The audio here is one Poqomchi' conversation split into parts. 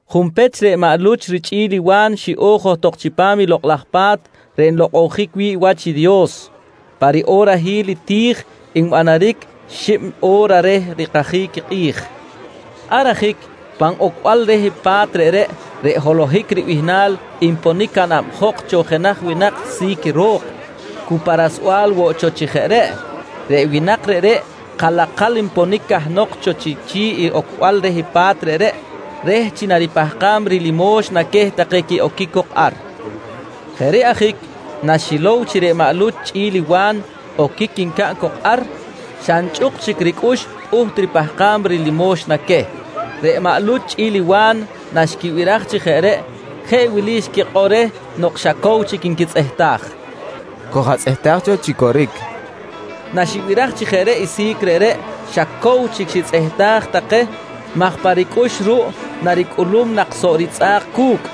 Junpech, reꞌ maꞌ Luch richꞌi̱l Wa̱n xiꞌo̱j johtok chipam i Lokꞌ laj Pa̱t reꞌ nlokꞌonjic wi̱ꞌ wach i Dios, pa riꞌorahil i ti̱j nbanaric xib o̱ra reh rikajic i kꞌi̱j. Ar ajic pan ocbal reh pa̱t reꞌreꞌ, reꞌ “Holohic” ribihnal nponic canabjok cho jenaj winak si̱c ro̱k, cu pa rasbal woꞌ cho chi jeꞌ reꞌ. Reꞌ winak reꞌreꞌ kalakal nponic cahnok cho chi chi̱ꞌ i ocbal reh pa̱t reꞌreꞌ reh chi naripahkam rilimoxna queh take quiꞌoquic cok ar. Jeꞌ reꞌ ajic naxilow chi reꞌ maꞌ Luch chꞌi̱l i Wa̱n oquic ncaꞌn cok ar, xa nchꞌuk chic ricꞌux pꞌuht ripahkam rilimoxna queh. Reꞌ maꞌ Luch chꞌi̱l i Wa̱n naxquibiraj chi jeꞌ reꞌ jeꞌ wili xquikꞌor reh nok xa cow chic nquitzꞌehtaj: «Koj-atzꞌehtaj cho chi coric, nqui take reh. Naxibiraj chi jeꞌ reꞌ i si̱c reꞌreꞌ, xa cow chic xitzꞌehtaj take maj pa ricꞌux ruꞌ naricꞌulum laꞌ nak soꞌ ritzꞌa̱k cu̱cꞌ,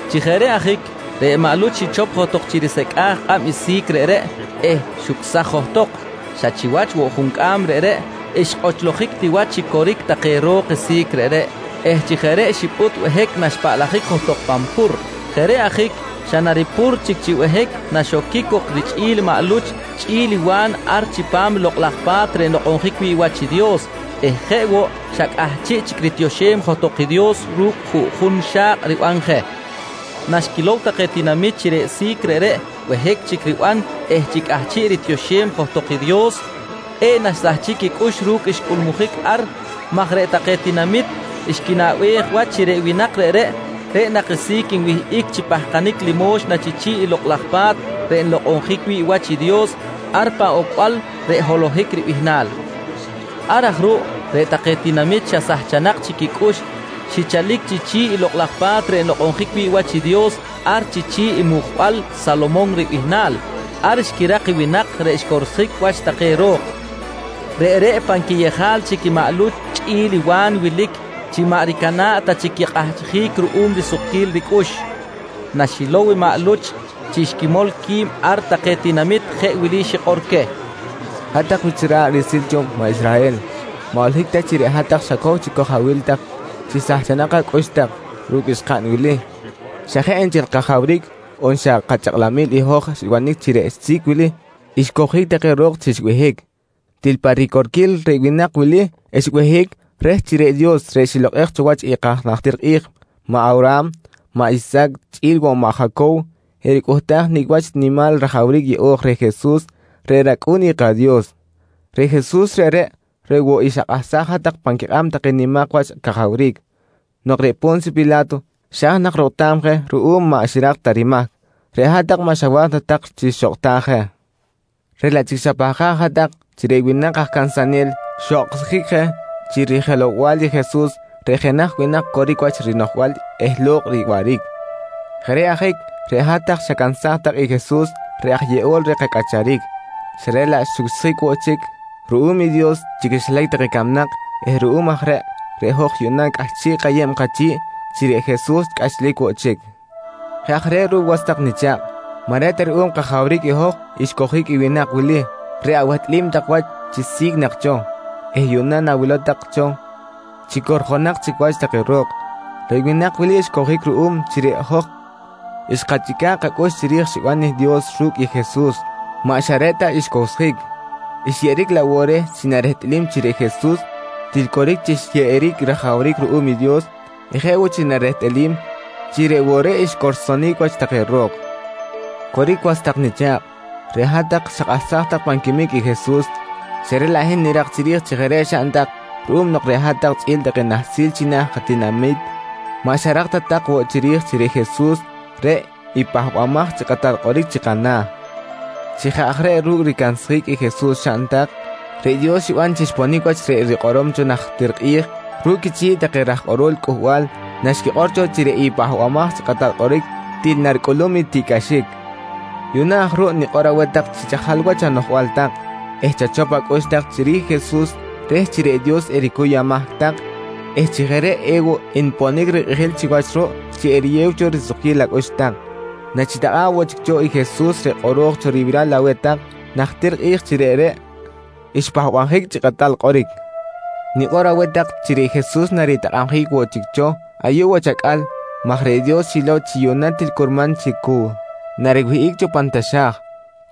Chi jeꞌ reꞌ ajic, reꞌ maꞌ Luch xichop johtok chi risecꞌa̱j kꞌab i si̱c reꞌreꞌ eh xucsaj johtok. Xa chiwach woꞌ juncꞌam reꞌreꞌ xkꞌochlojic ti wach chi coric take ro̱k i si̱c reꞌreꞌ eh chi jeꞌ reꞌ xipꞌut behic naxpaꞌlajic johtok pan pur. Jeꞌ reꞌ ajic xa naripur chic chi behic naxoquic cok richꞌi̱l maꞌ Luch chꞌi̱l i Wa̱n ar chipam i Lokꞌ laj Pa̱t reꞌ nlokꞌonjic wi̱ꞌ wach i Dios eh jeꞌ woꞌ xa cꞌahchiꞌ chic ritioxem johtok Dios ru̱cꞌ juꞌjun xa̱kꞌ riban je. Naxquilow take tinamit chi reꞌ si̱c reꞌreꞌ behic chic riban eh chi cꞌahchiꞌ ritioxem johtok i Dios, kꞌe̱ꞌ naxsahchic quicꞌux ru̱cꞌ xcꞌulmujic ar maj reꞌ take tinamit xquinaꞌbej wach chi reꞌ winak reꞌreꞌ, reꞌ nak i si̱c nwihꞌic chi pahkanic limo̱xna chi chi̱ꞌ i Lokꞌ laj Pa̱t reꞌ nlokꞌonjic wi̱ꞌ wach i Dios ar pan ocbal reꞌ “Holohic” ribihnal. Jeꞌ aj reꞌ ruꞌ, reꞌ take tinamit xa sahchanak chic quicꞌux xichalic chi chi̱ꞌ Lokꞌ laj Pa̱t reꞌ nlokꞌonjic wi̱ꞌ wach i Dios, ar chi chi̱ꞌ i mujbal “Salomon” ribihnal. Ar xquirak i winak reꞌ xcorsjic wach take ro̱k. Reꞌreꞌ pan quiyejal chic i maꞌ Luch chꞌi̱l i Wa̱n wilic chi maꞌ ricana̱ꞌ ta chic quikꞌahchjic ruꞌum risukquil ricꞌux. Naxilow maꞌ Luch chi xquimol qui̱b ar take tinamit jeꞌ wili xikꞌor queh: «Hat-tak wich ra̱ꞌ riꞌsil cho maꞌ Israhel, maꞌ holohic ta chi reꞌ hat-tak xacow chic koj-awil tak chi sahchanak acꞌux tak ru̱cꞌ xkaꞌn wili, xa jeꞌ nchel kajawric on xa kachakꞌlamil i hoj xbanic chi reꞌ si̱c wili xcowjic take ro̱k chi xbehic. Til pa ricorquil reꞌ winak wili xbehic reh chi reꞌ Dios reꞌ xilokꞌej cho wach i kaj najtir kꞌi̱j maꞌ Awraham, maꞌ Isahac chꞌi̱l woꞌ i maꞌ Jacow, ericꞌuhtaj nicꞌ wach nimal rajawric yeꞌo̱j reh Jesus reꞌ rAcꞌu̱n i kaDios. Reꞌ Jesus reꞌreꞌ, reꞌ woꞌ i xakꞌahsaj hat-tak pan quikꞌab take nimak wach cajawric. Nok reꞌ Po̱nsyo Pila̱to xa̱j nak rokꞌtam je ruꞌum maꞌ xirak ta rimahc, reꞌ hat-tak maꞌ xawa̱j ta tak chi xokꞌtaj je, reꞌ laꞌ chic xapahkaj hat-tak chi reꞌ winak aj cansanel xokꞌtjic je chi rijelow-bal i Jesus reꞌ jenaj winak coric wach rinoꞌjbal eh lo̱kꞌ riwaꞌric. Jeꞌ reꞌ ajic reꞌ hat-tak xacansaj tak i Jesus reꞌ aj yeꞌol reh kacꞌacharic, xa reꞌ laꞌ xucsjic woꞌ chic ruꞌum i Dios chi quixilac take camnak eh ruꞌum aj reꞌ, reꞌ hoj yuꞌna cꞌahchiꞌ kayeb kachi̱ꞌ chi reꞌ Jesus cꞌachlic woꞌ chic. «Jeꞌ aj reꞌ ruꞌ was tak nicha̱kꞌ, maꞌ reꞌ ta ruꞌum kajawric i hoj xcowjic i winak wili reꞌ awehtꞌalim tak wach chi si̱c nak cho eh yuꞌna nawilow tak cho chi corjonak chic wach take ro̱k. Reꞌ winak wili xcowjic ruꞌum chi reꞌ hoj xkachꞌica̱ꞌ kacꞌux chiri̱j xiban i Dios ru̱cꞌ i Jesus. Maꞌ xa reꞌ xcowsjic, xyeꞌeric laꞌ woꞌ reh chi narehtꞌalim chi reꞌ Jesus til coric chi xyeꞌeric rajawric ruꞌum i Dios eh jeꞌ woꞌ chi narehtꞌalim chi reꞌ woꞌ reꞌ xcorsonic wach take ro̱k. «Coric was tak nicha̱kꞌ, reꞌ hat-tak xakꞌahsaj tak pan quimic i Jesus, xa reꞌ laꞌ hin nirak chiri̱j chi jeꞌ reꞌ xaꞌn tak ruꞌum nok reꞌ hat-tak chꞌi̱l take nahsil china̱ katinami̱t maꞌ xarak ta tak woꞌ chiri̱j chi reꞌ Jesus, reꞌ i Pahbamaj chi Kꞌatal Kꞌoric chi kana̱. Chi jeꞌ aj reꞌ ru̱cꞌ ricansjic i Jesus xaꞌn tak, reꞌ Dios xiban chi xponic wach reꞌ rikꞌorom cho najtir kꞌi̱j ru̱cꞌ quichi̱ꞌ take raj kꞌorol cꞌuhbal naxquikꞌor cho chi reꞌ i Pahbamaj chi Kꞌatal Kꞌoric til naricꞌulum i tiꞌcꞌaxic. «Yuꞌna aj ruꞌ nikꞌor aweh tak chi chajal wach anoꞌjbal tak eh chachop acꞌux tak chiri̱j i Jesus reh chi reꞌ Dios ericuy amahc tak eh chi jeꞌ reꞌ ewoꞌ nponic rikꞌijil chiwach ruꞌ chi eriyew cho risukquil acꞌux tak nachitakꞌa̱ꞌ woꞌ chic cho Jesus reꞌ kꞌoro̱j cho ribiral aweh tak najtir kꞌi̱j chi reꞌreꞌ xpahbabjic chi Kꞌatal Kꞌoric. Nikꞌor aweh tak chi reꞌ Jesus naritakꞌabjic woꞌ chic cho ayuꞌ wach acꞌal maj reꞌ Dios xilow chi yuꞌna til curman chi cu nariwihꞌic cho pan taxa̱j,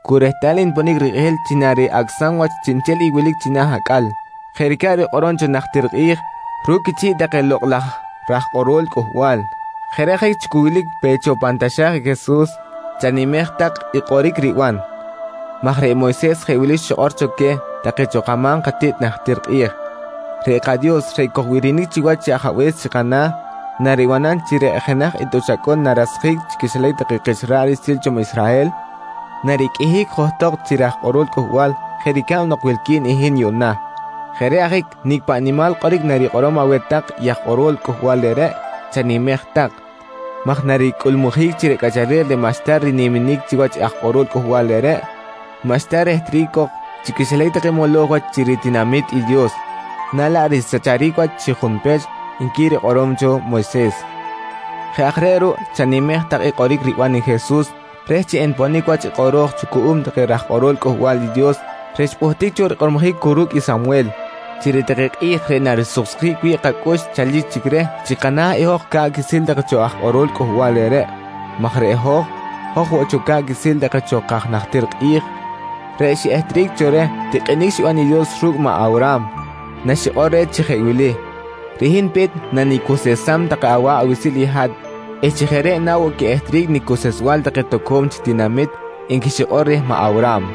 cu rehtal nponic rikꞌijil chi nariꞌacꞌsam wach chiꞌnchel i wilic china̱ acꞌal jeꞌ ricab rikꞌorom cho najtir kꞌi̱j ru̱cꞌ quichi̱ꞌ take lokꞌ laj raj kꞌorol cꞌuhbal. Jeꞌ reꞌ ajic chi cu wilic pe cho pan taxa̱j i Jesus, chanimej tak i kꞌoric riban maj reꞌ Moyses jeꞌ wili xikꞌor cho queh take cho kama̱m katiꞌt najtir kꞌi̱j: “Reꞌ kaDios reꞌ kojbirinic chiwach chi Ajabe̱s chi kana̱, naribanam chi reꞌ jenaj i tꞌuch acꞌun narasjic chi quixilac take kich ra̱ꞌ riꞌsil cho maꞌ Israhel, nariqꞌuihic johtok chi raj kꞌorol cꞌuhbal jeꞌ ricab nok wilqui̱n i hin yuꞌna. Jeꞌ reꞌ ajic nicꞌ paꞌ nimal kꞌoric narikꞌorom aweh tak i aj kꞌorol cꞌuhbal reꞌreꞌ, chanimej tak maj naricꞌulmujic chi reꞌ cꞌacharel reꞌ maꞌxta riniminic chiwach aj kꞌorol cꞌuhbal reꞌreꞌ, maꞌxta rehtric cok chi quixilac take moloj wach chi ritinami̱t i Dios, na laꞌ risacharic wach chi junpech, nqui rikꞌorom cho Moyses. «Jeꞌ aj reꞌ ruꞌ chanimej tak i kꞌoric riban i Jesus reh chi enponic wach i kꞌoro̱j cho cuꞌum take raj kꞌorol Cꞌuhbal i Dios reꞌ xpꞌuhtic cho rikꞌormojic cu ru̱cꞌ i Samwel, chi reꞌ take kꞌi̱j reꞌ narisuksjic wi̱ꞌ kacꞌux chalic chic reh chi kana̱ i hoj ca̱ꞌ quiꞌsil take cho aj kꞌorol cꞌuhbal reꞌreꞌ, maj reꞌ hoj, hoj woꞌ cho ca̱ꞌ quiꞌsil take cho kaj najtir kꞌi̱j reꞌ xiꞌehtric cho reh tikꞌinic xiban i Dios ru̱cꞌ maꞌ Awraham naxikꞌor reh chi jeꞌ wili: “Reꞌ hin pe̱t nanicuseꞌsam take awa̱ꞌ awiꞌsil i hat eh chi jeꞌ reꞌ na woꞌ quiꞌehtric nicuseꞌsbal take toco̱m chic tinamit, nqui xikꞌor reh maꞌ Awraham.